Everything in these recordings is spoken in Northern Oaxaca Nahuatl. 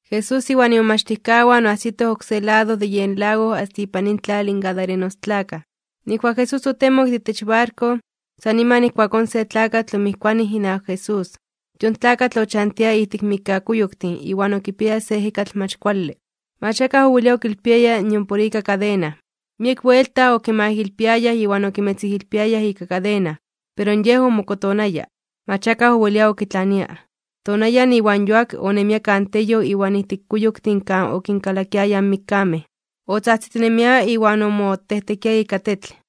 Jesús iwan imomachtijkawan oajsitoj oksé lado de yen lago asta ipan intlal in gadarenostlakaj. Nijkuak Jesús otemok de itech barko, san niman ijkuakón se tlakatl omijkuanij inawak Jesús. Yon tlakatl ochantia ijtik mikkakuyoktin iwan okipiaya se ejekatl mach kuale. Mach akaj owelia okilpiaya nion por ika kadena. Miek buelta okimaijilpiayaj iwan okimetzijilpiayaj (okikxijilpiayaj) ika kadena, pero yej omokotonaya. Mach akaj owelia okitlania. Tonayan iwan yuak, onemia kan teyoj iwan ijtik kuyoktin kan okinkalakiayaj mikkamej. Otzajtzitinemia iwan omotejtekia ika tetl.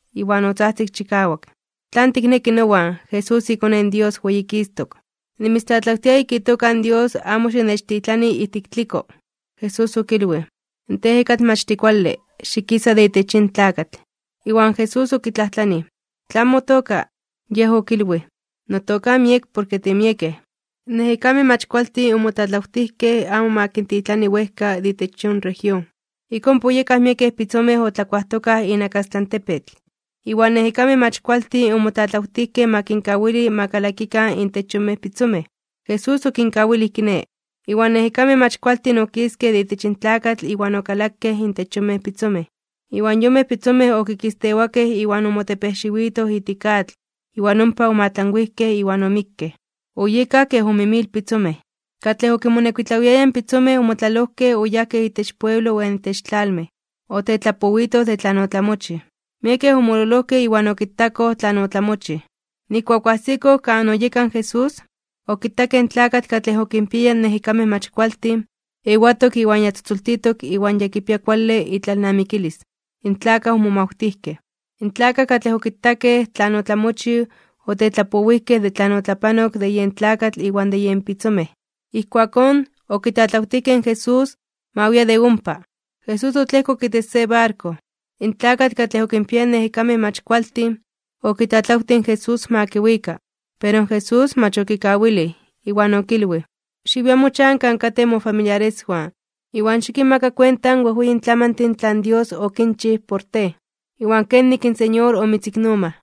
Iwan otzajtzik chikawak: ―¿Tlan tikneki nowan, Jesús, iKone in Dios Weyikistok (Weyititok)? ¡Nimitztlatlawtia ika itoka in Dios amo xinechtitlani ijtik tliko! Jesús okilwij: ―¡Tej ejekatl mach tikuale, xikisa de itech yin tlakatl! Iwan Jesús okitlajtlanij: ―¿Tlan motoka? Yej okilwij: ―Notoka miek porke timiekej. In ejekamej mach kualtin omotlatlawtijkej amo ma kintitlani wejka de itech yon región. Ik ompa oyekaj miekej pitzomej otlakuajtokaj inakastlan tepetl. Iwan ejekamej mach kualtin okitlatlawtijkej, okilwijkej: ―Xitechkawili ma tikalakikan intech nekatej pitzomej. Jesús okinkawilij kiné, iwan in ejekamej mach kualtin okiskej de itech in tlakatl iwan okalakej intech yonmej pitzomej, iwan yonmej pitzomej okikistewakej iwan omotepejxiwitoj ijtik atl iwan ompa omoatlanwijkej iwan omikkej. Oyekaj kej ome mil pitzomej. Katlej okinmonekuitlawiayaj in pitzomej omotlalojkej oyajkej itech pueblo iwan itech tlalmej, otetlapowitoj de tlan otlamochij. Miekej omololojkej iwan okitakoj tlan otlamochij. Nijkuak oajsikoj kan oyeka in Jesús, okitakej in tlakatl katlej okinpiaya ejekamej mach kualtin, ewatok iwan ya tzotzoltitok iwan ya kipia kuale itlalnamikilis. In tlakaj omomawtijkej. In tlakaj katlej okitakej tlan otlamochij otetlapowijkej de tlan otlapanok de yen tlakatl iwan de yen pitzomej. Ijkuakón okitlatlawtijkej in Jesús ma wia de ompa. Jesús otlejkok itech se barko. In tlakatl katlej okinpiaya in ejekamej mach kualtin, okitlatlawtij in Jesús ma kiwika. Pero in Jesús mach okawilij, iwan okilwij: ―Xiwia mochan kan katej mofamiliareswan, iwan xikinmaka kuenta in wejweyin tlamantin tlan Dios okinchij por tej, iwan kenik in Señor omitziknomaj.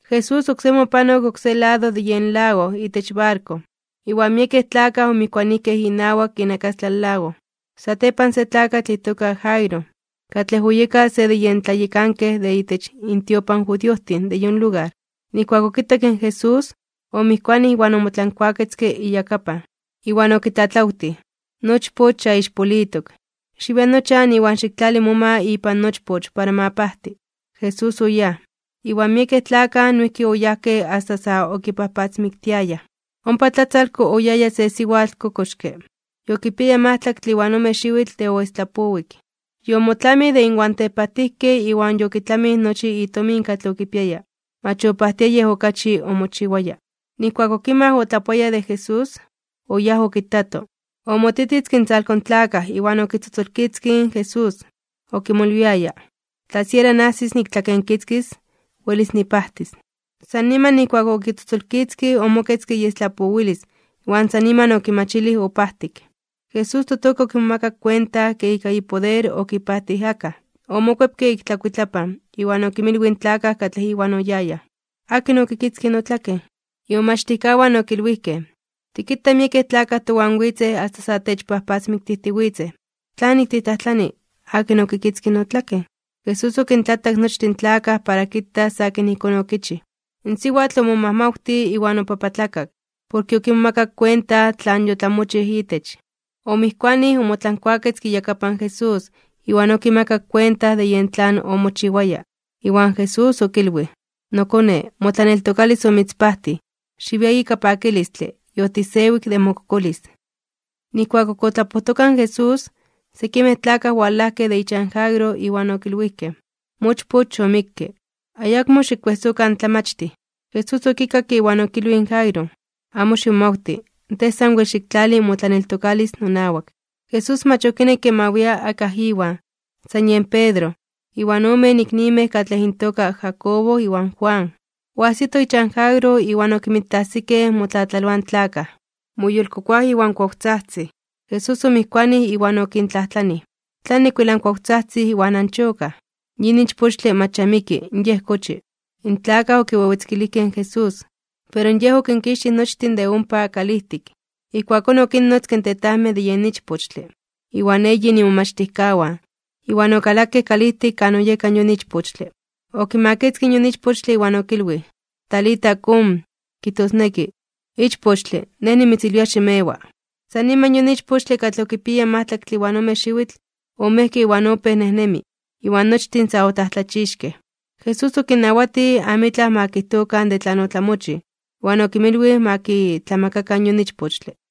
Jesús oksemi opanok oksé lado de yen lago itech barko, iwan miekej tlakaj omijkuanijkej inawak inakastlan lago. Satepan se tlakatl itoka Jairo, katlej oyeka se de yen tlayekankej de itech intiopan in judiojtin de yon lugar, nijkuak okitak in Jesús, omijkuanij iwan omotlankuaketzke iyakapan. Iwan okitlatlawtij: ―Nochpoch ya ixpolitok. Xiwia nochan iwan xiktlali moma ipan nochpoch para ma pajti. Jesús oyáj, iwan miekej tlakaj noijki oyajkej asta sa okipajpatzmiktiayaj. Ompa tlatzalko oyaya se siwatl kokoxke. Yokipiaya majtlaktle iwan ome xiwitl de oestlapowik. Yomotlamij de inwan tepajtijkej iwan yokitlamij nochi itomin katlej okipiaya. Mach opajtia yej okachi omochiwaya. Nijkuak okimaj otlapoayaj de Jesús, oyáj okitato, omotititzke intzalko in tlakaj iwan okitzotzolkitzkij in Jesús. Okimolwiaya: “Tla siera najsis niktlakenkitzkis, welis nipajtis.” San niman nijkuak okitzotzolkitzkij omoketzke iestlapowilis iwan san niman okimachilij opajtik. Jesús totoka okimomakak kuenta ke ika ipoder okipajtij akaj. Omokuepke ik tlakuitlapan iwan okinmilwij in tlakaj katlej Iwan oyayaj: ―¿Akin okikitzkij notlaken? Imomachtijkawan okilwijkej: ―Tikita miekej tlakaj towan witzej asta sa techpajpatzmiktijtiwitzej. ¿Tlanik titlajtlani? “¿Akin okikitzkij notlaken?” Jesús okintlatak nochtin tlakaj para kitas akin ijkón okichij. In siwatl omomajmawtij iwan opapatlakak (obibiokak) porke okimomakak kuenta tlan yotlamochij itech. Omijkuanij, omotlankuaketzke iyakapan Jesús iwan okimakak kuenta de yen tlan omochiwaya. Iwan Jesús okilwij: ―Nokone, motlaneltokalis omitzpajtij. Xiwia ika pakilistle, yotisewik de mokokolis. Nijkuak ok otlapojtoka in Jesús, sekimej tlakaj owalajkej de ichan Jairo iwan okilwijkej: ―Mochpoch yomikke, ayakmo xikkuejsokan in Tlamachtij. Jesús okikakke iwan okilwij in Jairo: ―Amo ximomawti, tej sanwel xiktlali motlaneltokalis nonawak. Jesús mach okinekke ma wia akaj Iwan, san yen Pedro, iwan omen iknimej katlej intoka Jacobo iwan Juan. Oajsitoj ichan Jairo iwan okinmitajsikej motlatlaloaj in tlakaj, moyolkokoaj iwan kuawtzajtzij. Jesús omijkuanij iwan okintlajtlanij: ―¿Tlanik wel ankuawtzajtzij iwan anchokaj? Yin ichpochtle mach ya miki, yej kochi. In tlakaj okiwewetzkilijkej in Jesús, pero Yej okinkixtij nochtin de ompa kalijtik. Ijkuakón okinnotzke in tetajmej de yen ichpochtle, iwan eyin imomachtijkawan, iwan okalakej kalijtik kan oyeka yon ichpochtle. Okimakitzkij yon ichpochtle iwan okilwij: ―Talita, kum ―kijtosneki: Ichpochtle, Nej nimitzilwia, ximewa. San niman yon ichpochtle katlej okipiaya majtlaktle iwan ome xiwitl, omejke iwan opéj nejnemi, iwan nochtin sa otlajtlachixkej (omomajmawtijkej). Jesús okinnawatij amitlaj ma kijtokan de tlan otlamochij. Iwan okinmilwij ma kitlamakakan yon ichpochtle.